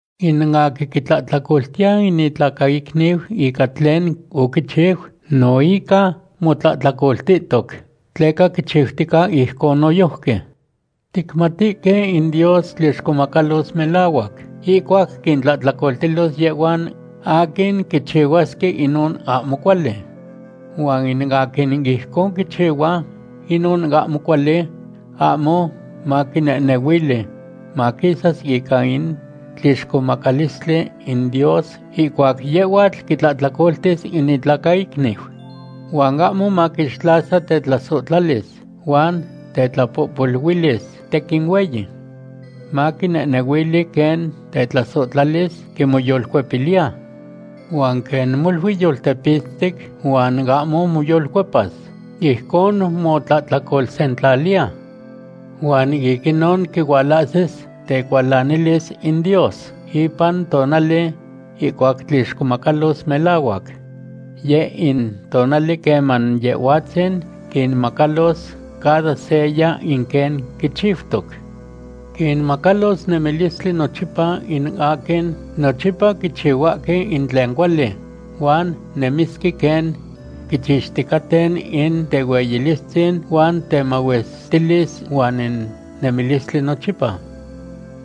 In aquin quitlahtlacoltiya in itlacaicniu ica tlen oquichiu no ica motlahtlacoltihtoc, tleca quichiutica ijcon noyojqui. Ticmatihque in Dios tlixcomacalos melahuac ihcuac quintlahtlacoltilos yehhuan aquin quichihuasque inon ahmo cuali. Huan in aquin ijcon quichihua inon ahmo cuali ahmo maquinehnehuili maquisas ica in tlixcomacalistli in Dios ihcuac yehhuatl quitlahtlacoltis in itlacaicniu. Huan ahmo maquixtlasa tetlasohtlalis huan tetlapohpoluilis tequin hueyi. Maquinehnehuili quen tetlasohtlalis quimoyolcuepiliya. Huan quen molui yoltepitztic huan ahmo moyolcuepas, ijcon motlahtlacolsentlaliya. Huan ic inon quihualahsis tecualanilis in Dios ipan tonali ihcuac tlixcomacalos melahuac. Yeh in tonali queman Yehhuatzin quinmacalos cada seya in quen quichiutoc. Quinmacalos nemilistli nochipa in aquin nochipa quichihuahque in tlen cuali huan nemisque quen quichixticaten in tehueyilistzin huan temahuestilis huan in nemilistli nochipa.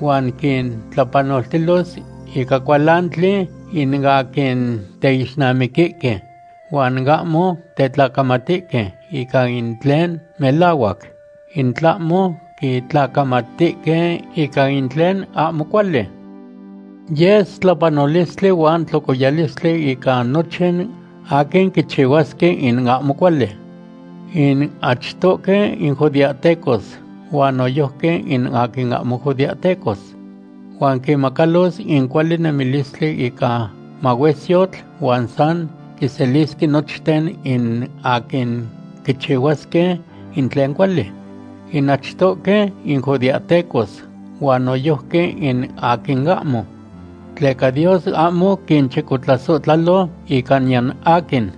Huan quintlapanoltilos ica cualantli in aquin teixnamiquihque huan ahmo tetlacamatihque ica in tlen melahuac, in tlahmo quitlacamatihque ica in tlen ahmo cuali. Yes tlapanolistli huan tlocoyalistli ica nochin aquin quichihuasque in ahmo cuali. In achtohque in judeahtecos huan noyojqui in aquin ahmo judeahtecos. Huan quinmacalos in cuali nemilistli ica mahuesyotl huan san quiselisque nochten in aquin quichihuasque in tlen cuali, in achtohque in judeahtecos, huan noyojqui in aquin ahmo. Tleca Dios ahmo quichicotlasohtlalo ica niyan aquin.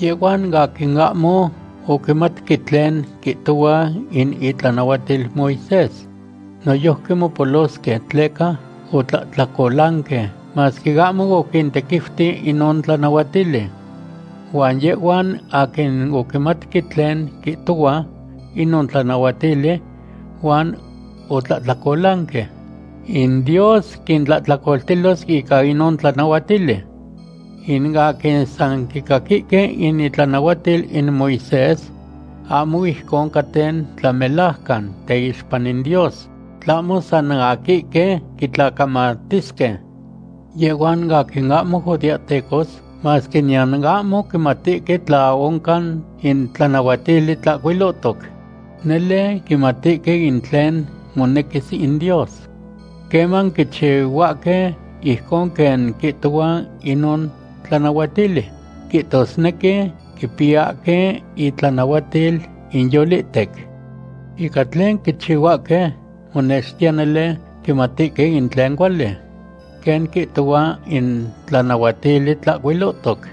Yehhuan aquin ahmo oquimatque tlen quihtohua in itlanahuatil Moisés noyojqui mopolosque tleca otlahtlacolanque, masque ahmo oquintequiuti inon tlanahuatili. Huan yehhuan aquin oquimatque tlen quihtohua inon tlanahuatili huan otlahtlacolanque, in Dios quintlahtlacoltilos ica inon tlanahuatili. In aquin san quicaquihque in itlanahuatil in Moisés, ahmo ijcon caten tlamelajcan teixpa in Dios, tlahmo san aquihque quitlacamatisque. Yehhuan aquin ahmo judeahtecos, masque niyan ahmo quimatihque tla oncan in tlanahuatili tlahcuilohtoc, nele quimatihque in tlen monequis in Dios. Queman quichihuahque ijcon quen quihtohua inon tlanahuatili, quihtosnequi quipiyahque intlanahuatil inyolihtec. Ica tlen quichihuahque, monextiya nele quimatihque in tlen cuali, quen quihtohua in tlanahuatili tlahcuilohtoc,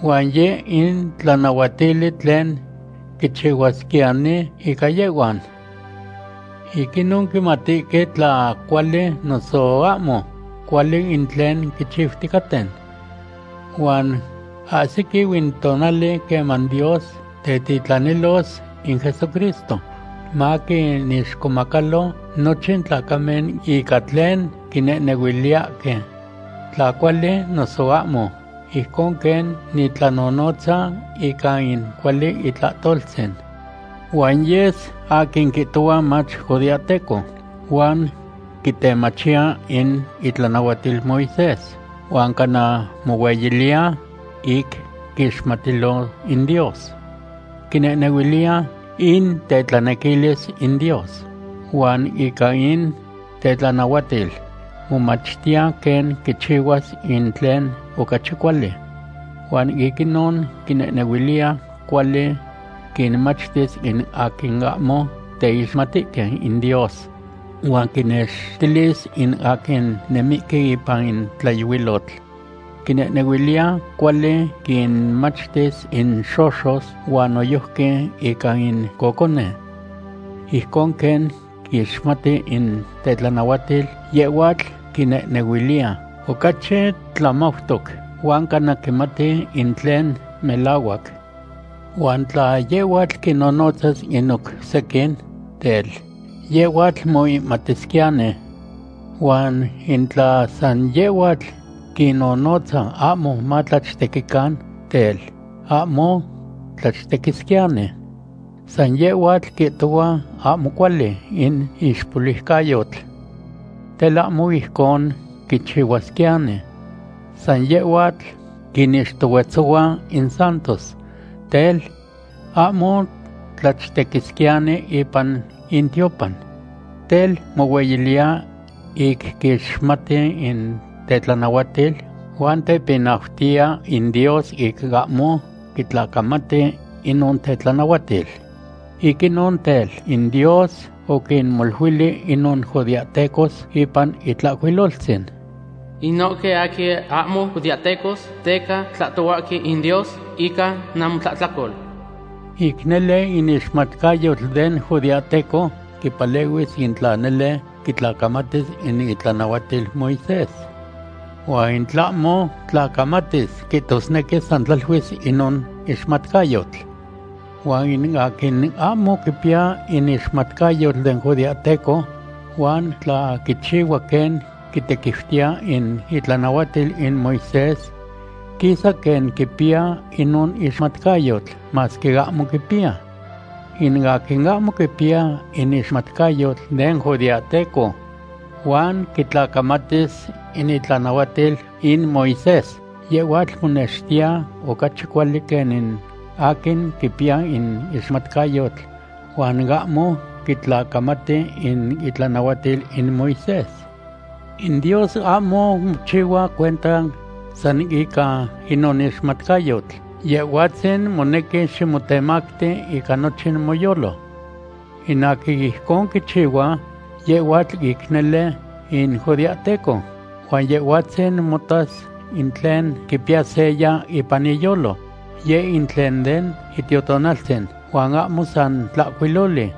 huan yeh in tlanahuatili tlen quichihuasquiyani ica yehhuan. Ic inon quimatihque tla cuali noso ahmo cuali in tlen quichiuticaten. Huan ahsiquiu in tonali queman Dios tetitlanilos in Jesucristo maquinixcomacalo nochin tlacamen ica tlen quinehnehuiliyahque, tla cuali noso ahmo, ijcon quen nitlanonotza ica in cuali itlahtoltzin. Huan yes aquin quihtohua mach judeahteco, huan quitemachiya in itlanahuatil Moisés, huan cana mohueyiliya ic quiixmatilo in Dios. Quinehnehuiliya in tetlanequilis in Dios, huan ica in tetlanahuatil momachtiya quen quichihuas in tlen ocachi cuali. Huan ic inon quinehnehuiliya cuali quinmachtis in aquin ahmo teixmatihque in Dios, huan quinnextilis in aquin nemihque ipan in tlayohuilotl. Quinehnehuiliya cuali quinmachtis in xoxos huan noyojqui ica in cocone. Ijcon quen quixmati in tetlanahuatil, yehhuatl quinehnehuiliya ocachi tlamautoc, huan cana quimati in tlen melahuac. Huan tla yehhuatl quinnonotzas in oc sequin, tel, yehhuatl moihmatisquiyani. Huan in tla san yehhuatl quinnonotza ahmo matlachtequican, tel, ahmo tlachtequisquiyani. San yehhuatl quihtohua ahmo cuali in ixpoluicayotl. Tel, ahmo ijcon quichihuasquiyani. San yehhuatl quinixtohuetzohua in santos. Tel, ahmo tlachtequisquiyani ipan intiopan. Tel, mohueyiliya ic quixmati in tetlanahuatil, huan tepinautiya in Dios ic ahmo quitlacamati inon tetlanahuatil. Ic inon tel, in Dios oquinmoluili inon judeahtecos ipan Itlahcuiloltzin: “Inohque aquin ahmo judeahtecos teca tlahtohuahque in Dios ica namotlahtlacol.” Ic nele in ixmatcayotl den judeahteco quipalehuis in tla nele quitlacamatis in itlanahuatil Moisés. Huan in tlahmo tlacamatis, quihtosnequi san tlaluis inon ixmatcayotl. Huan in aquin ahmo quipiya in ixmatcayotl den judeahteco, huan tla quichihua quen quitequiutiya in itlanahuatil in Moisés, quisa quen quipiya inon ixmatcayotl, masque ahmo quipiya. In aquin ahmo quipiya in ixmatcayotl den judeahteco, huan quitlacamatis in itlanahuatil in Moisés, yehhuatl monextiya ocachi cuali quen in aquin quipiya in ixmatcayotl huan ahmo quitlacamati in itlanahuatil in Moisés. In Dios ahmo mochihua cuenta san ica inon ixmatcayotl. Yehhuatzin monequi ximotemacti ica nochin moyolo. In aquin ijcon quichihua, yehhuatl ic nele in judeahteco, huan Yehhuatzin motas in tlen quipiya seya ipan iyolo, yeh in tlen den Itiotonaltzin huan ahmo san tlahcuiloli.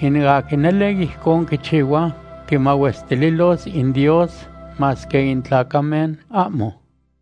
In aquin nele ijcon quichihua, quimahuestililos in Dios, masque in tlacamen ahmo.